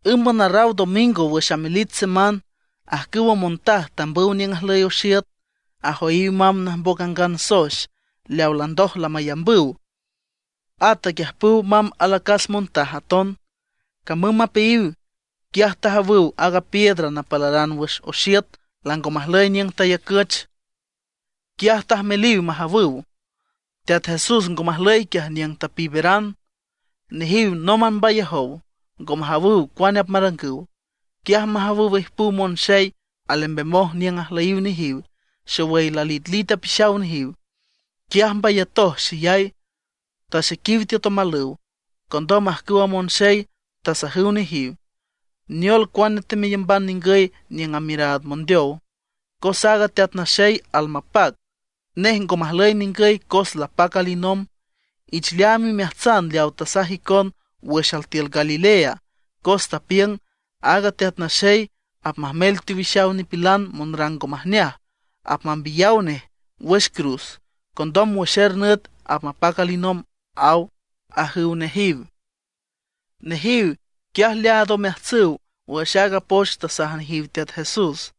Ǘmban arraw domingo wüx amelich seman, ajcüwa montaj tambüw niüng ajlüy oxiüt; ajoyiw mamb najmboc angan soex leawa landoj lamayambüw. At aquiüjpüw mamb alacas montaj aton. Camüm mapeayiw, quiaj tajawüw aaga piedra napalaran wüx oxiüt lango majlüy niüng tayacüch. Quiaj tajmeliw majawüw. Teat Jesús ngo majlüy quiaj niüng tapiiberan. Nejiw nómban mbayajow, ngo majawüw cuane apmarangüw. Quiaj majawüw ijpüw monxey alembemoj niüng ajlüyiw nejiw, xowüy lalitlit apixaw nejiw. Quiaj mbayatoj xeyay, taxequiw tiüt omalüw. Condom ajcüwa monxey tasajüw nejiw: ―¿Neol, cuane temeyamban ningüy niüng amiüraad mondeow? cos aaga Teat Naxey almapac. Nej ngo majlüy ningüy cos lapac alinomb. Ich leaam imeajtsan leaw tasaj icon wüx altiül Galilea. Cos tapiüng, aaga Teat Naxey apmajmel teowixaw nipilan monrang ngo majneaj, apmambiyaw nej wüx cruz. Condom wüx er nüt apmapac alinomb, aw ―ajüw nejiw. Nejiw quiaj leaad omeajtsüw wüx aaga poch tasaj nejiw Teat Jesús.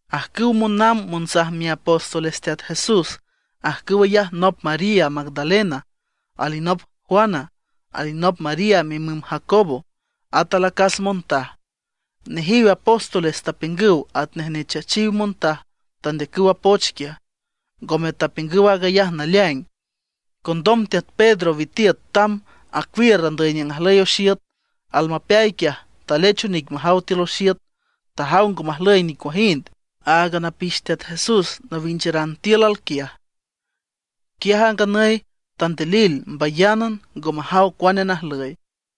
Ajcüwa monamb monsaj miapóstoles Teat Jesús, ajcüw ayaj nop María Magdalena, alinop Juana, alinop María mimüm Jacobo, at alacas montaj. Nejiw apóstoles tapiüngüw atnej nechachiw montaj tandeacüw a poch quiaj; ngome tapiüngüw aag ayaj naleaing. Condom teat Pedro witiüt tamb acuiür andüy niüng ajlüy oxiüt. Almapeay quiaj talech onic majaw tiül oxiüt, tajaw ngo majlüy nicuajind, áagan apix Teat Jesús nawincharan tiül alquiaj. Quiaj a nganüy tandilil mbayánan, ngo majaw cuane najlüy.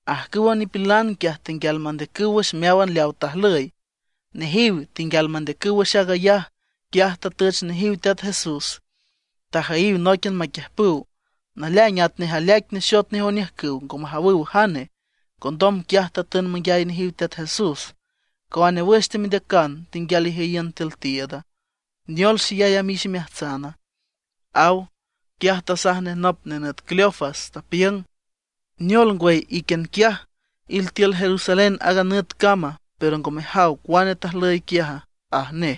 Ajcüwa nipilan quiaj tenguial mandeacüw wüx meáwan leawa tajlüy. Nejiw tenguial mandeacüw wüx aag ayaj, quiaj tatüch nejiw Teat Jesús, tajüyiw nóiquian maquiüjpüw. Naleaing atnej aleaic nexot nej oniüjcüw, ngo majawüw jane. Condom quiaj tatün manguiay nejiw Teat Jesús: ―¿Cuane wüx temendeacan tenguial ijüyiün tiül tiiüda? ¿Neol xeyay amix imeajtsana? ―aw. Quiaj tasaj nej nop nenüt Cleofas, tapiüng: ―¿Neol ngwüy, íquian quiaj iltiül Jerusalén aaga nüt cam, pero ngo mejaw cuane tajlüy quiaja? ―aj nej.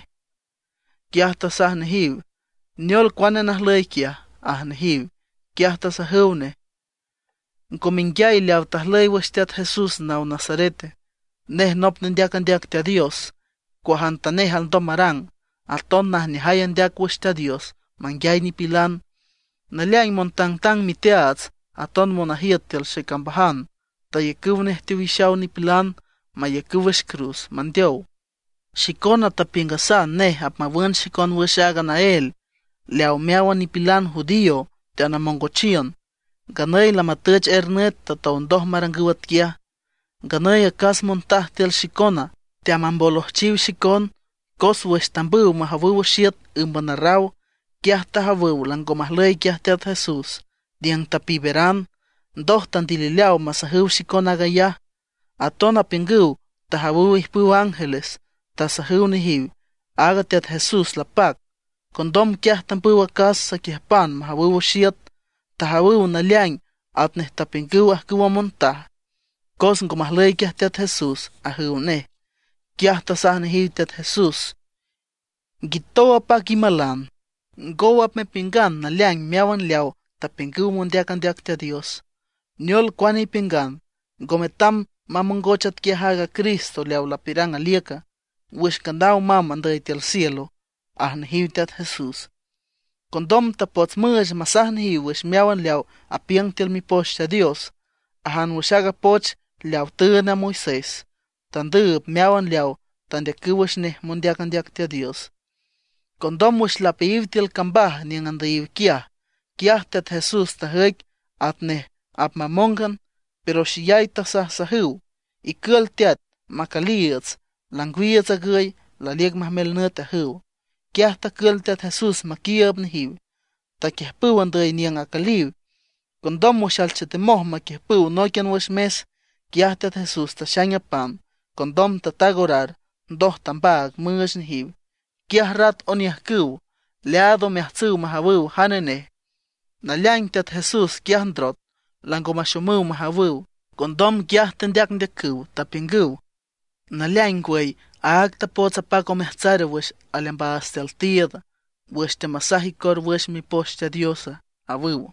Quiaj tasaj nejiw: ―¿Neol, cuane najlüy quiaja? ―aj nejiw. Quiaj tasajüw nej: ―¿Ngo menguiay leaw tajlüy wüx Teat Jesús naw Nazarete? Nej nop nendeac andeac Teat Dios, cuajantanej alndom marang, aton najneajay andeac wüx Teat Dios manguiay nipilan. Naleaing montangtang miteaats, aton monajiüt tiül xecambajan tayacüw nej teowixaw nipilan mayacüw wüx cruz, mandeow. Xicona tapiüngasan nej apmawün xicon wüx aaga naél leawa meáwan nipilan judío teanamongochiün. Nganüy lamatüch er nüt tatow ndoj marangüw atquiaj. Nganüy acas montaj tiül xicona teamambolojchiw xicon; cos wüx tambüw majawüw oxiüt ǘmban arraw, quiaj tajawüw lango majlüy quiaj Teat Jesús niüng tapiiberan. Ndoj tandilileaw masajüw xicon aag ayaj. Aton apiüngüw tajawüw ijpüw ángeles, tasajüw nejiw aaga Teat Jesús lapac. Condom quiaj tambüw acas saquiüjpan majawüw oxiüt. Tajawüw naleaing atnej tapiüngüw ajcüwa montaj, cos ngo majlüy quiaj Teat Jesús ―ajüw nej. Quiaj tasaj nejiw Teat Jesús: ―¡Nguitow apac imalan! ¡Ngow apmepiüngan naleaing meáwan leawa tapiüngüw mondeac andeac Teat Dios! ¿Neol cuane ipiüngan, ngo metam mamongoch atquiaj aaga Cristo leaw lapiürang aliüca, wüx nganaw mamb andüy tiül cielo? ―aj nejiw Teat Jesús. Condom tapots müüch masaj nejiw wüx meáwan leaw apiüng tiül Mipoch Teat Dios, ajan wüx aaga poch leawa tüünd a Moisés, tandüüb meáwan leaw tandeacüw wüx nej mondeac andeac Teat Dios. Condom wüx lapeayiw tiül a cambaj niüng andüyiw quiaj, quiaj Teat Jesús tajüic atnej apmamóngan. Pero xeyay tasajsajüw: ―Icül teat, macüliiüts, langwiiüts agüy, laliüc majmel nüt ―ajüw. Quiaj tacül Teat Jesús maquiiüb nejiw, taquiüjpüw andüy niüng acüliw. Condom wüx alchetemoj maquiüjpüw nóiquian wüx mes, quiaj Teat Jesús taxaing a pan, condom tataag orar, ndoj tambaag müüch nejiw. Quiaj rat oniüjcüw, leaad omeajtsüw majawüw jane nej. Naleaing Teat Jesús quiaj ndrot, lango maxomüw majawüw. Condom quiaj tendeacndeacüw, tapiüngüw: ―¿Naleaing ngwüy, áag tapots apac omeajtsar wüx aleambaats tiül tiiüd, wüx teamasaj icor wüx Mipoch Teat Dios? ―awüw.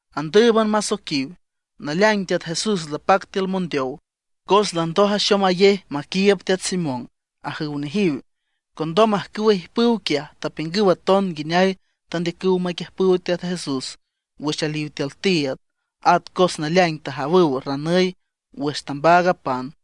Andǘüban masoiquiw: ―Naleaing Teat Jesús lapac tiül mondeow, cos landoj axomayej maquiiüb teat Simón ―ajüw nejiw. Condom ajcüwa ijpüw quiaj tapiüngüw aton nguineay tandeacüw maquiüjpüw Teat Jesús wüx aliw tiül tiiüd, at cos naleaing tajawüw ranüy wüx tambaag a pan.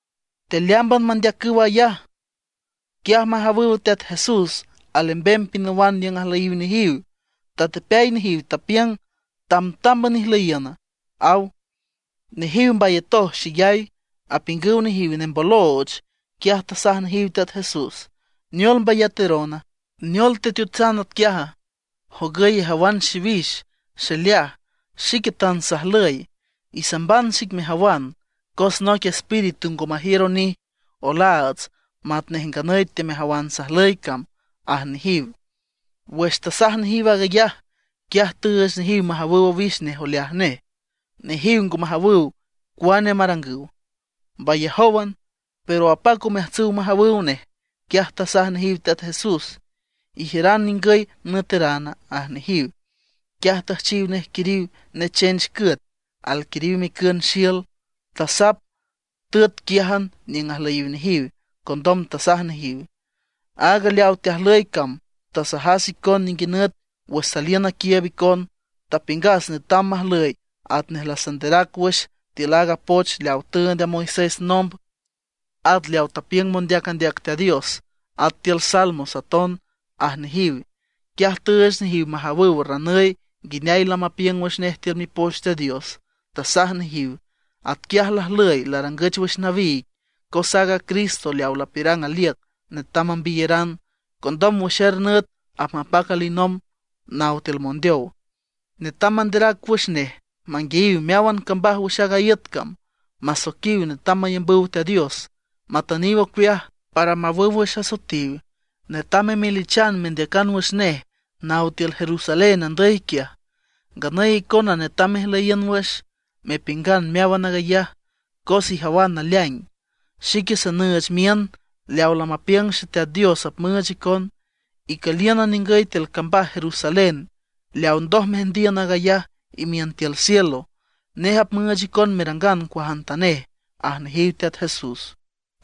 Tealeámban mandeacüw aag ayaj, quiaj majawüw Teat Jesús alembem pinawan niüng ajlüyiw nejiw. Tatepeay nejiw, tapiüng: ―Tamtámban ijlüyiüna ―aw. Nejiw mbayatoj xeyay, apiüngüw nejiw nembolooch. Quiaj tasaj nejiw Teat Jesús: ―¿Neol mbayaterona? ¿Neol teteotsan atquiaja? Jogüy ijawan xiwix, xileaj. Xique tan sajlüy. Isamban xic mejawan, cos noic espíritu ngo majiür onij olaats matnej nganüy teamejawan sajlüy cam ―aj nejiw. Wüx tasaj nejiw aag ayaj, quiaj tüüch nejiw majawüw owix nej oleaj nej. Nejiw ngo majawüw cuane marangüw, mbayajówan, pero apac omeajtsüw majawüw nej. Quiaj tasaj nejiw Teat Jesús: ―¿Ijiüran ningüy nüeterana? ―aj nejiw. Quiaj tüjchiw nej quiriw nechench cüet, alquiriw micün xiül. Tasap, tüet quiájan niüng ajlüyiw nejiw. Condom tasaj nejiw: ―Aaga leaw teajlüy cam tasajas icon ninguinüt wüx saliün naquiiüb icon. Tapiüngas netam majlüy atnej lasanderac wüx tiül aaga poch leawa tüünd a Moisés nomb, at leaw tapiüngüw mondeac andeac Teat Dios, at tiül salmos aton ―aj nejiw. Quiaj tüüch nejiw majawüw ranüy nguineay lamapiüng wüx nej tiül Mipoch Teat Dios. Tasaj nejiw: ―Atquiaj lajlüy larangüch wüx nawiig, cos aaga Cristo leaw lapiürang aliüc netam mambiyeran. Condom wüx er nüt apmapac alinomb naw tiül mondeow. Netam manderac wüx nej manguiayiw meáwan cambaj wüx aaga iüt cam, masoiquiw netam mayambüw Teat Dios, matüniw ocueaj, para mawüw wüx asoetiw. Netam memelichan mendeacan wüx nej naw tiül Jerusalén andüy quiaj. Nganüy icona netam mejlüyiün wüx, mepiüngan meáwan aag ayaj cos ijawan naleaing. Xique sanüüch miün leawa lamapiüng Xeteat Dios apmüüch icon. Icülíünan ningüy tiül cambaj Jerusalén leaw ndoj meajndiün aag ayaj imiün tiül cielo. Nej apmüüch icon merangan cuajantanej ―aj nejiw Teat Jesús.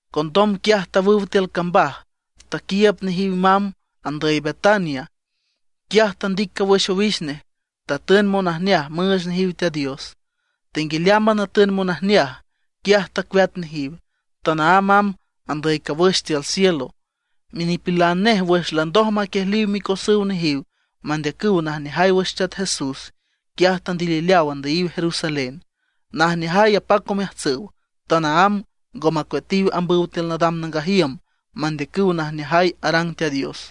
Condom quiaj tawüw tiül cambaj, taquiiüb nejiw mamb andüy Betania. Quiaj tandic cawüx owix nej, tatün monajneaj müüch nejiw Teat Dios. Tenguialeámban atün monajneaj, quiaj tacueat nejiw, tanaámb amb andüy cawüx tiül cielo. Minipilan nej wüx landoj maquiejliw micosüw nejiw mandeacüw najneajay wüx Teat Jesús, quiaj tandilileaw andüyiw Jerusalén, najneajay apac omeajtsüw. Tanaámb ngo macueatiw ambüw tiül nadam nangaj iüm mandeacüw najneajay arang Teat Dios.